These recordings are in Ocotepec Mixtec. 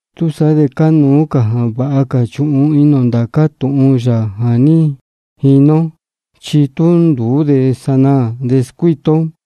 Túsaá de cánuú jā vāha cā chuhun inī ō ndācá tūhun yā jā ní jini ó, chi tú nduú de sanaā de scuíta ó.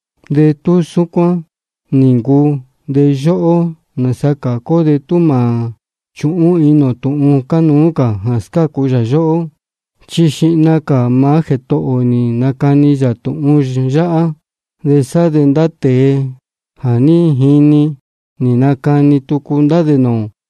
De tú súcuán nī ncuu, de yóhó, ¿nāsa cācu ó de tú mā chūhún inī ō tūhun cánuú cā jā scácu yā yóhó? Chi xihna cā maá Jētohō ō nī nacani yā tūhun yáhá, de sá de ndá tēe jā ní jini, nī nacani tucu ndá dē nūū ō.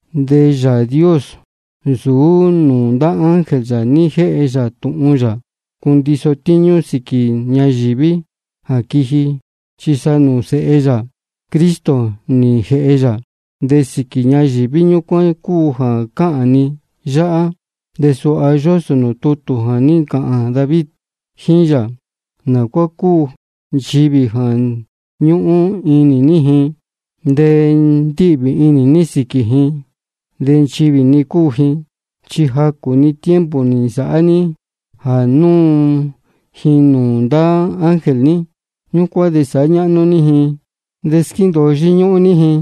De Yāā Dios nsūú nūū ndá ángel yā ní jéhe yā tūhun jā cundiso tíñú sīquī ñayīví jā quiji, chi sa nūū Sēhe yā Cristo nī jēhe yā. De sīquī ñayīví ñúcuán cúu jā cáhān ni yáhá. Chi suha yósō nūū tutū jā ní ncāhān David jíín yā: ¿Nā cuá cúu nchivī jā ñúhún inī ní ji? De ndíhvī inī ní sīquī ji, de nchivī-ni cúu ji. Chi jacū-ni tiempo nī nsāhá ní jā núu ji nūū ndá ángel ní. Ñúcuán de sāhá ñáhnú ní ji de squéndōo yíñúhún ní ji,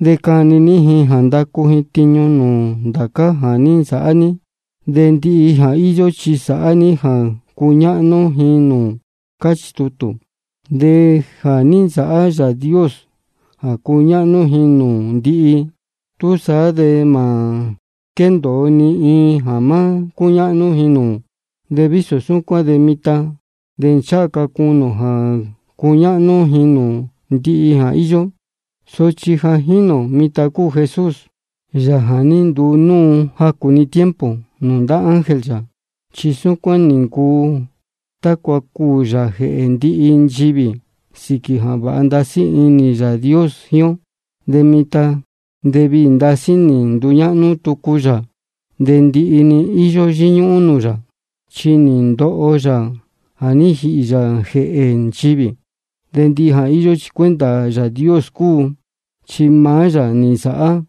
de cani ní ji jā ndacu ji tiñu nūū ndācá jā ní nsāhá ní. De ndihi jā íyó chi sāhá ní jā cuñáhnú ji nūū. Cáchī tutū. De jā ní nsāhá Yāā Dios jā cúñáhnú ji nūū ndihi, túsaá de mā quéndōo ni iin jā má cúñáhnú ji nūū. De vísō súcuán de mitan de ncháha ca cunī ō jā cúñáhnú ji nūū ndihi jā íyó. Sochi jā jínī ō mitan cúu Jesús, Yāā jā ní nduu núu jacū-ni tiempo nūū ndá ángel yā. Chi súcuán nī ncuu tácua cuū yā jēhē ndihi nchivī, sīquī jā vāha ndasí inī Yāā Dios jíín ó. De mitan de viī ndasí nī nduñáhnú tucu yā, de ndihi-ni íyó yíñúhún nūū yā, chi nī ndoho yā jā ní jīhī yā jēhē nchivī. De ndihi jā íyó chi cuenta Yāā Dios cúu, chi maá yā nī nsāhá.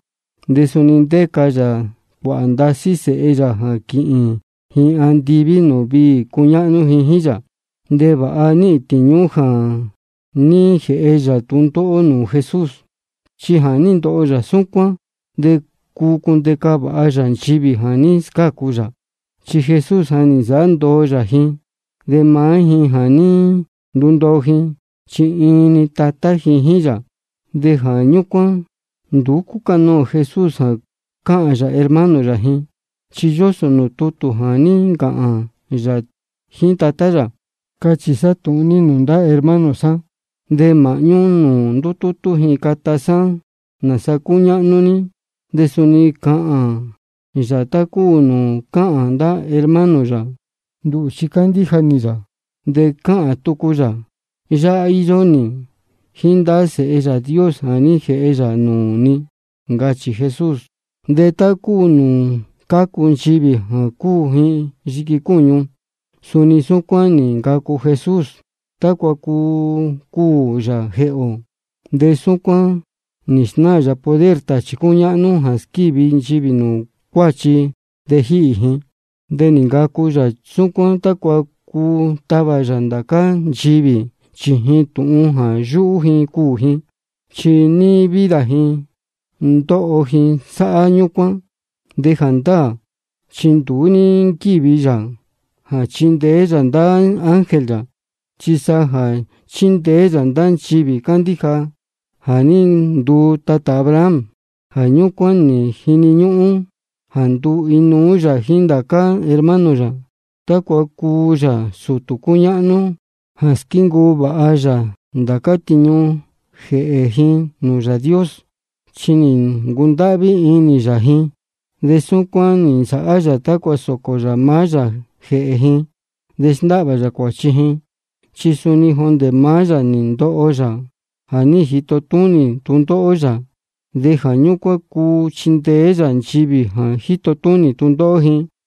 De suni ndéca yā cuāhā ndasí sēhe yā jā quíhīn ji andiví nūū viī cuñáhnú ji jíín yā. De vāha níhīn tīñú jā ní jēhe yā tūndóhó nūū Jesús, chi jā ní ndoho yā súcuán de cuu cundeca vāha yā nchivī jā ní scácu yā. Chi Jesús jā ní nsāhá ndoo yā ji de maá ji jā ní ndundoo ji, chi iin-ni Tatá ji jíín yā. De jā ñúcuán nduú cúcanoō Jesús jā cáhān yā hermano yā ji. Chi yósō nūū tutū jā ní ncāhān yā jíín Tatá yā: Cachī sá tūhun ní nūū ndá hermano sá, de māhñú nūū ndútútú ji cata sá nāsa cúñáhnú ní. De suni cáhān yā tá cúu nūū cáhān ndá hermano yā: Nduhū chi cándíja nī yā. De cáhān tucu yā: Yáhá íyó nī jíín ndá sēhe Yāā Dios jā ní jēhe yā nūū ni. Ncachī Jesús. De tá cúu nūū cácu nchivī jā cúu ji iin yiqui cúñu, suni súcuán nī ncacu Jesús, tácua cuu cuū yā jēhē ō. De súcuán nī snáā yā poder tāchī cúñáhnú jā squívi nchivī nūū cuāchi de jíhī ji. De nī ncacu yā súcuán tácua cuu tavā yā ndācá nchivī chījin tūhun jā yúhú ji cuū ji. Chi níí vida ji ndóho ji sáhá ñúcuán. De jāndáā chi nduú ní nquíji yā jā chindeé yā ndá ángel yā, chi sa jā chindeé yā ndá nchivī cándíja jā ní nduu tatā Abraham. Jā ñúcuán nī jini ñúhún jā nduu inuú yā jíín ndācá hermano yā, tácua cuu yā sūtū cúñáhnú jā squíncuu vāha yā ndācá tiñu jēhē ji nūū Yāā Dios, chi nī ncundáhví inī yā ji. De súcuán nī nsāhá yā tácua sōcō yā maá yā jēhē ji de sndáhvā yā cuāchi ji. Chi suni jondē maá yā nī ndoho yā jā ní jito túnī tūndóhó yā, de jā ñúcuán cuu chindeé yā nchivī jā jíto túnī tūndóhó ji.